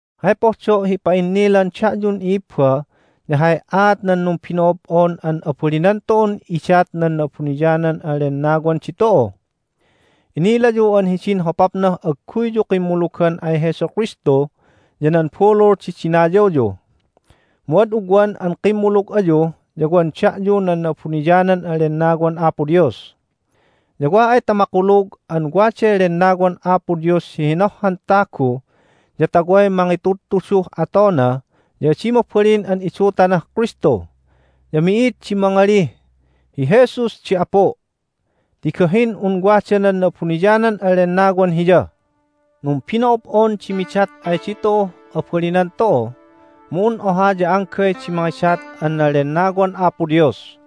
Hay pohdo' hi ipa'innilan da'yun i'ibba ya hay aat nan numbino'ob'on an abalinan tu'un idat nan Na'abuniyanan an Lennawan ditu'u. Inilayu an hidin hopapnah agguyyu kimmulugan ay Jesu Kristu ya nan bulul di dinayawyu. Mu ad ugwan an kimmulug ayu ya wan da'yu nan Na'abuniyanan an Lennawan Apo Dios. Ya wa ay ta makulug an waday Lennawan Apo Dios hi hinohhan tagu ya ta way mangitudtuduh atona ya adi mabalin an idutanah Kristu. Ya mi'id di mangalih, "Hi Jesus di Apu'," ti gahin un wada nan Na'abuniyanan an Lennawan hiya. Numbino'ob'on di midat ay ditu'uh abalinan tu'u, mu un oha ya anggay di mangidat an nan Lennawan Apo Dios.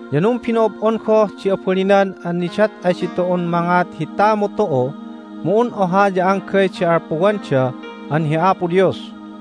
Ya numbino'ob'on goh di abalinan an nidat ay ditu'un mangat hi tamu tu'u, mu un oha ya anggay di alpuwanda an hi Apo Dios.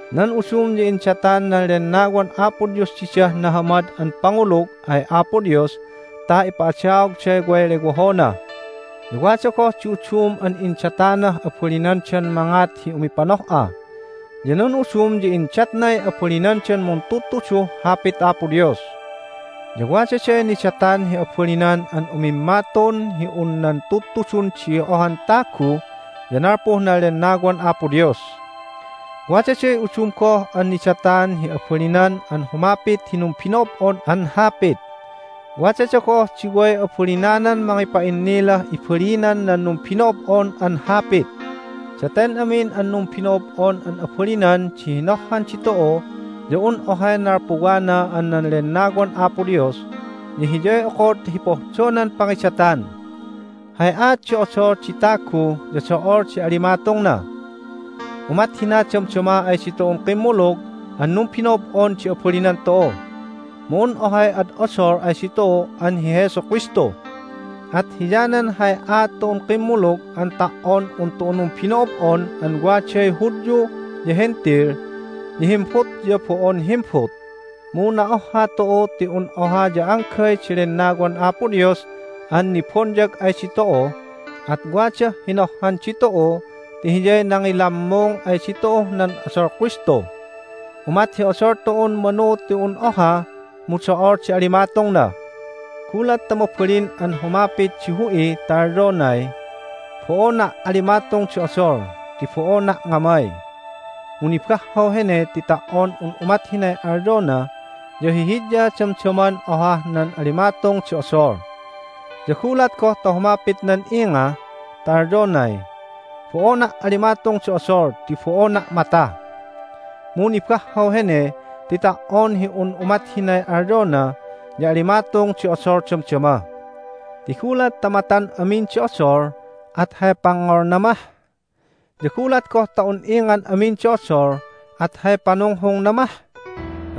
Nan udum ya indatan nan Lennawan Apo Dios didah nahamad an pangulug ay Apo Dios ta ipa'adaogday way lewohona. Ya wada goh di udum an indatanah abalinandan mangat hi umipanoh'a. Ya nan udum ya indatnay abalinandan muntudtuduh Hapit Apo Dios. Ya wadaday nidatan hi abalinan an umimmatun hi un nan tudtudun di ohan tagu ya nalpuh nan Lennawan Apo Dios. Wadaday udum goh an nidatan hi abalinan an humapit hi numbino'ob'on an hapit. Wadada goh di way abalinanan mangipa'innilah ibalinan nan numbino'ob'on an hapit. Daten amin an numbino'ob'on an abalinan di hinohhan ditu'u ya un ohay nalpuwana an nan Lennawan Apo Dios, ya Hiyay okod hi pohdonan pangidatan. Hay aat di odol di tagu ya do'ol di alimatungna. Umat hina damdama ay ditu'un kimmulug an numbino'ob'on di abalinan tu'u, mu un ohay ad odol ay ditu'u an hi Jesu Kristu. At hiyanan hay aat tu'un kimmulug an ta"on un tu'u numbino'ob'on an waday Hudyu ya Hentil, ya himbut ya bo'on himbut, mu na'ohha tu'u ti un oha ya anggay di Lennawan Apo Dios an nibonyag ay ditu'u, at wadah hinohhan ditu'u ti Hiyay nangilammung ay ditu'uh nan odol Kristu. Umat hi odol tu'un manu ti un oha, mu do'ol di alimatungna. Gulat ta mabalin an humapit di hu'i ta alyonay, "Bo'ona' alimatung di odol ti bo'ona' ngamay!" mu nibahhaw hene ti ta"on un umat hinay alyona ya hihidya damdaman ohah nan alimatung di odol. Ya gulat goh ta humapit nan inga ta alyonay, "Bo'ona' alimatung di odol ti bo'ona' mata!" mu nibahhaw hene ti ta"on hi un umat hinay alyona ya alimatung di odol damdama. Ti gulat ta matan amin di odol at hay pangngolna mah? Ya gulat goh ta un ingan amin di odol at hay panunghungna mah?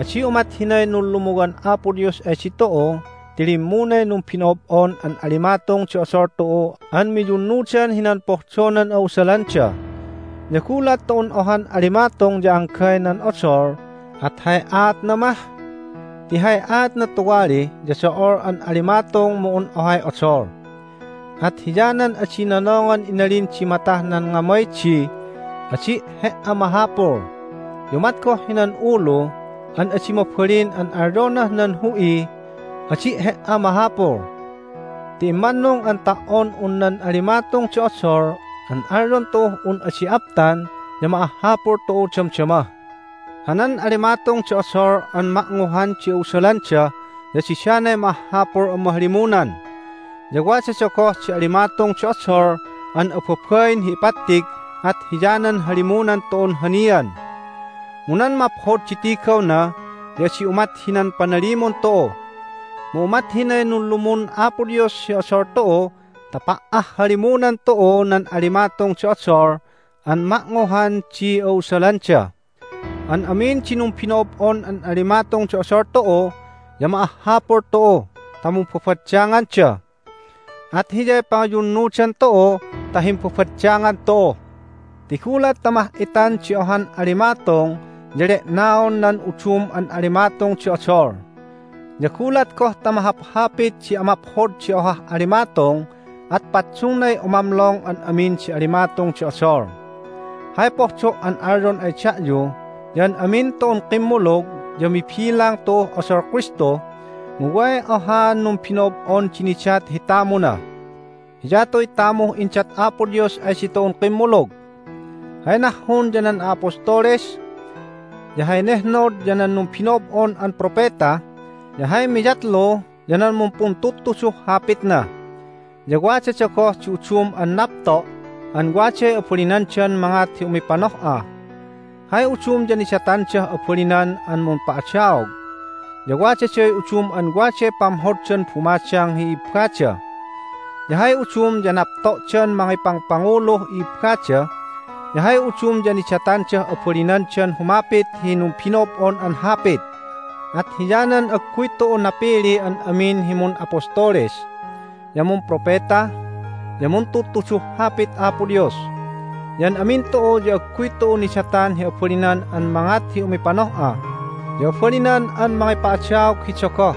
Adi umat hinay nunlumuwan Apo Dios ay ditu'u ti limmunay numbino'ob'on an alimatung di odol tu'u an miyunnudan hinan pohdonan a'usalanda. Ya gulat ta un ohan alimatung ya anggay nan odol at hay aatna mah? Ti hay aatna tuwali ya do'ol an alimatung mu un ohay odol. At hiyanan adi nonongan inalin di matah nan ngamay di, "Adi' he"a mahapul!" Ya umat goh hinan ulu an adi mabalin an alyonah nan hu'iy, "Adi' he"a mahapul!" Ti immannung an ta"on un nan alimatung di odol an alyon tu'uh un adi aptan ya ma'ahhapul tu'u damdama. Hanan alimatung di odol an ma'nguhan di a'usalanda ya didanay ma'ahhapul an mahalimunan. Ya wadada goh di alimatung di odol an ababain hi ipattig at hiyanan halimunan tu'un hanian, mu nan maphod di tigawna ya adi umat hinan panalimun tu'u. Mu umat hinay nunlumun Apo Dios hi odol tu'u ta pa'ahhalimunan tu'u nan alimatung di odol an ma'nguhan di a'usalanda. An amin di numbino'ob'on an alimatung di odol tu'u ya ma'ahhapul tu'u ta mumbabaddanganda. At hiyay pangiyunnudan tu'u ta himbabaddangan tu'u. Ti gulat ta mah'itan di ohan alimatung ya le'naon nan udum an alimatung di odol. Ya gulat goh ta mahaphapit di amaphod di ohah alimatung at paddungnay umamlong an amin di alimatung di odol. Hay pohdo' an alyon ay da'yu ya an amin tu'un kimmulug ya mibilang tu'uh odol Kristu, mu way ohaan numbino'ob'on di nidat hi tamuna. Hiyatuy tamuh indat Apo Dios ay ditu'un kimmulug. Hay nahhun ya nan a'apostoles, ya hay nehnod ya nan numbino'ob'on an propeta, ya hay miyatlu ya nan mumpuntudtuduh Hapitna. Ya wadada goh di udum an napto' an waday abalinandan mangat hi umipanoh'a. Hay udum ya nidatandah abalinan an mumpa'adaog, ya wadaday udum an waday pamhoddan bumadang hi i'ibbada. Ya hay udum ya napto'dan mangipangpanguluh i'ibbada, ya hay udum ya nidatandah abalinandan humapit hi numbino'ob'on an hapit. At hiyanan agguy tu'u napili an amin hi mun'apostoles, ya mumpropeta, ya muntudtuduh Hapit Apo Dios. Ya an amin tu'u ya agguy tu'u nidatan hi abalinan an mangat hi umipanoh'a, ya abalinan an mangipa'adaog hi dogoh.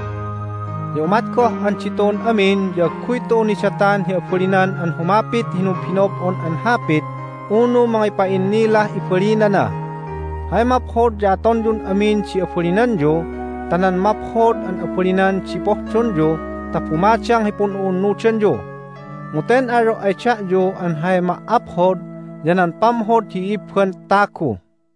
Ya umat goh an ditu'un amin ya agguy tu'u nidatan hi abalinan an humapit hi numbino'ob'on an hapit unu mangipa'innilah ibalinana. Hay maphod ya atonyun amin di abalinanyu ta nan maphod an abalinan di pohdonyu ta bumadang hi pun'u'unnudanyu. Mu ten alyo' ay da'yu an hay ma"aphod ya nan pamhod hi i'ibban tagu.